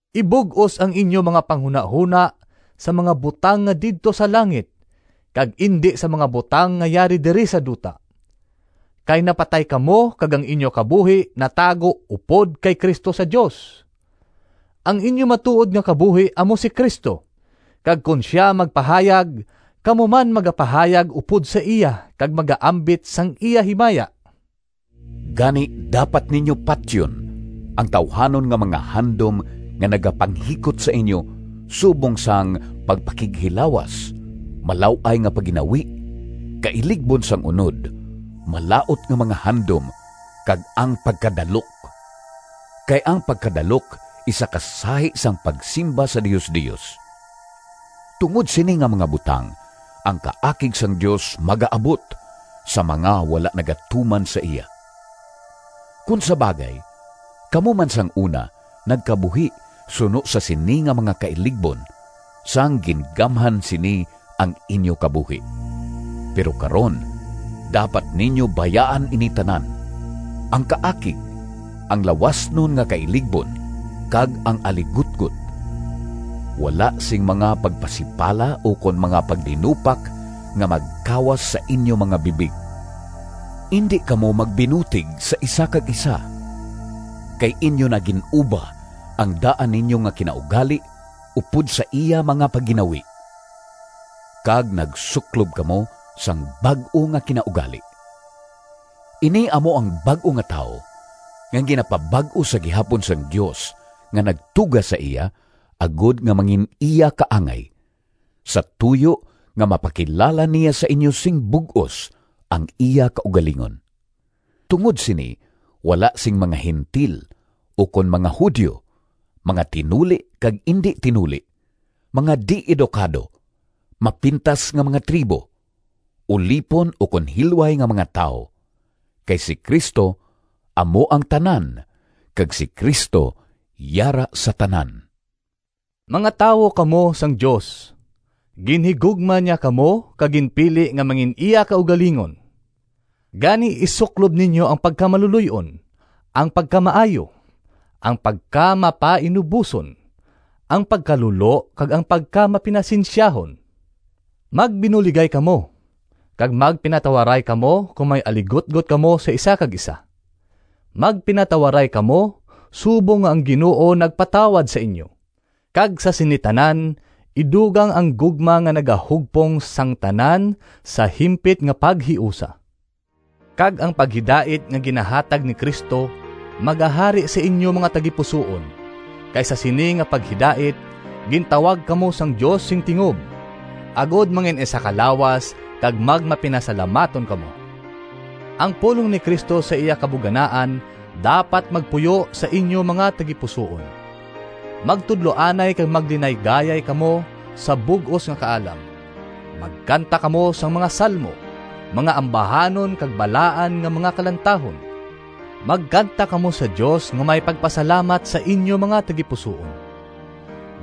Ibug-os ang inyo mga panghunahona sa mga butang nga didto sa langit kag indi sa mga butang nga yari diri sa duta. Kay napatay kamo kag ang inyo kabuhi natago upod kay Cristo sa Dios. Ang inyo matuod nga kabuhi amo si Cristo, kag kon sia magpahayag, kamo man magapahayag upod sa iya kag magaambit sang iya himaya! Gani dapat ninyo patyon ang tawuhanon nga mga handom nga nagapanghikot sa inyo subong sang pagpakighilawas, malaw-ay nga pagginawi, kailigbon sang unod, malaut nga mga handom, kag ang pagkadalok (kay ang pagkadalok isa ka sahi sang pagsimba sa diosdios). Tungod sini nga mga butang ang kaakig sang Dios magaabot sa mga wala nagatuman sa iya. Kon sa bagay, kamo man sang una nagkabuhi suno sa sini nga mga kailigbon, sang gingamhan sini ang inyo kabuhi. Pero karon, dapat ninyo bayaan ini tanan: ang kaakig, ang lawasnon nga kailigbon kag ang aligutgot. Wala sing mga pagpasipala ukon mga pagdinupak nga magkawas sa inyo mga bibig. Indi kamo magbinutig sa isa kag isa, kay inyo na gin-uba ang daan ninyo nga kinaugali upod sa iya mga pagginawi, kag nagsuklob kamo sang bag-o nga kinaugali. Ini amo ang bag-o nga tawo, nga ginapabag-o sa gihapon sang Dios nga nagtuga sa iya agod nga mangin-iya kaangay, sa tuyo nga mapakilala niya sa inyo sing bug-os ang iya kaugalingon. Tungod sini wala sing mga Gentil, ukon mga Judio, mga tinuli kag indi tinuli, mga di-edukado, mapintas nga mga tribo, ulipon ukon hilway nga mga tawo, kay si Cristo amo ang tanan kag si Cristo yara sa tanan. Mga tawo kamo sang Dios. Ginhigugma niya kamo kag ginpili nga mangin-iya kaugalingon. Gani isuklob ninyo ang pagkamaluloy-on, ang pagkamaayo, ang pagkamapainuboson, ang pagkalulo kag ang pagkamapinasensyahon. Magbinuligay kamo, kag magpinatawaray kamo kon may aligutgot kamo sa isa kag isa. Magpinatawaray kamo subong nga ang Ginoo nagpatawad sa inyo. Kag sa sini tanan idugang ang gugma nga nagahugpong sang tanan sa himpit nga paghiusa. Kag ang paghidait nga ginahatag ni Cristo magahari sa inyo mga tagipusoon, kay sa sini nga paghidait gintawag kamo sang Dios sing tingob, agod mangin-isa ka lawas. Kag magmapinasalamaton kamo. Ang pulong ni Cristo sa iya kabuganaan dapat magpuyo sa inyo mga tagipusoon. Magtudloanay kag maglinaygayay kamo sa bug-os nga kaalam. Magkanta kamo sang mga salmo, mga ambahanon kag balaan nga mga kalantahon. Magkanta kamo sa Dios nga may pagpasalamat sa inyo mga tagipusoon.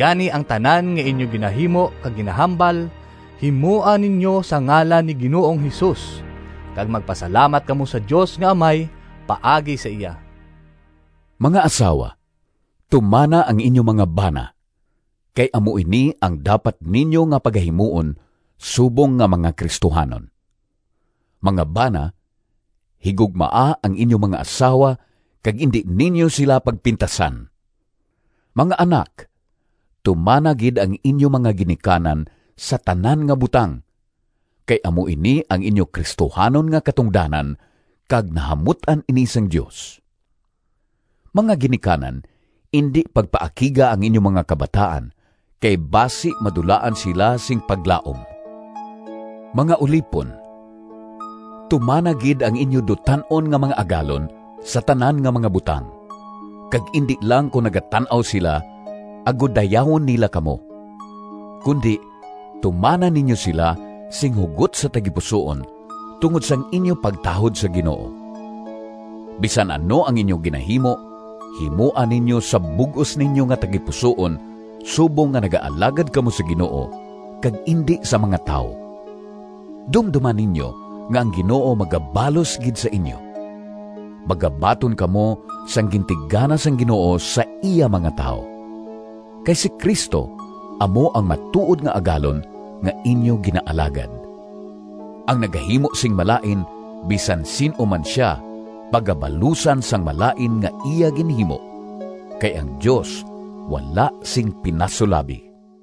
Gani, ang tanan nga inyo ginahimo kag ginahambal, himoa ninyo sa ngalan ni Ginoong Jesus kag magpasalamat kamo sa Dios nga Amay paagi sa iya. Mga asawa tumana ang inyo mga bana, kay amo ini ang dapat ninyo nga pagahimuon subong nga mga Cristohanon. Mga bana, higugmaa ang inyo mga asawa kag indi ninyo sila pagpintasan. Mga anak, tumana gid ang inyo mga ginikanan sa tanan nga butang, kay amo ini ang inyo Cristohanon nga katungdanan kag nahamut-an ini sang Dios. Mga ginikanan, indi pagpaakiga ang inyo mga kabataan, kay basi madulaan sila sing paglaom. Mga ulipon, tumana gid ang inyo dutan-on nga mga agalon sa tanan nga mga butang, kag indi lang kon nagatan-aw sila agod dayawon nila kamo, kundi tumana ninyo sila sing hugot sa tagipusoon tungod sang inyo pagtahod sa Ginoo. Bisan ano ang inyo ginahimo, himoa ninyo sa bug-os ninyo nga tagipusoon subong nga nagaalagad kamo sa Ginoo kag indi sa mga tawo. Dumdoma ninyo nga ang Ginoo magabalos gid sa inyo. Magabaton kamo sang gintigana sang Ginoo sa iya mga tawo. Kay si Cristo amo ang matuod nga Agalon nga inyo ginaalagad. Ang nagahimo sing malain, bisan sin-o man sia pagabalusan sang malain nga iya ginhimo kay ang Dios wala sing pinasulabi.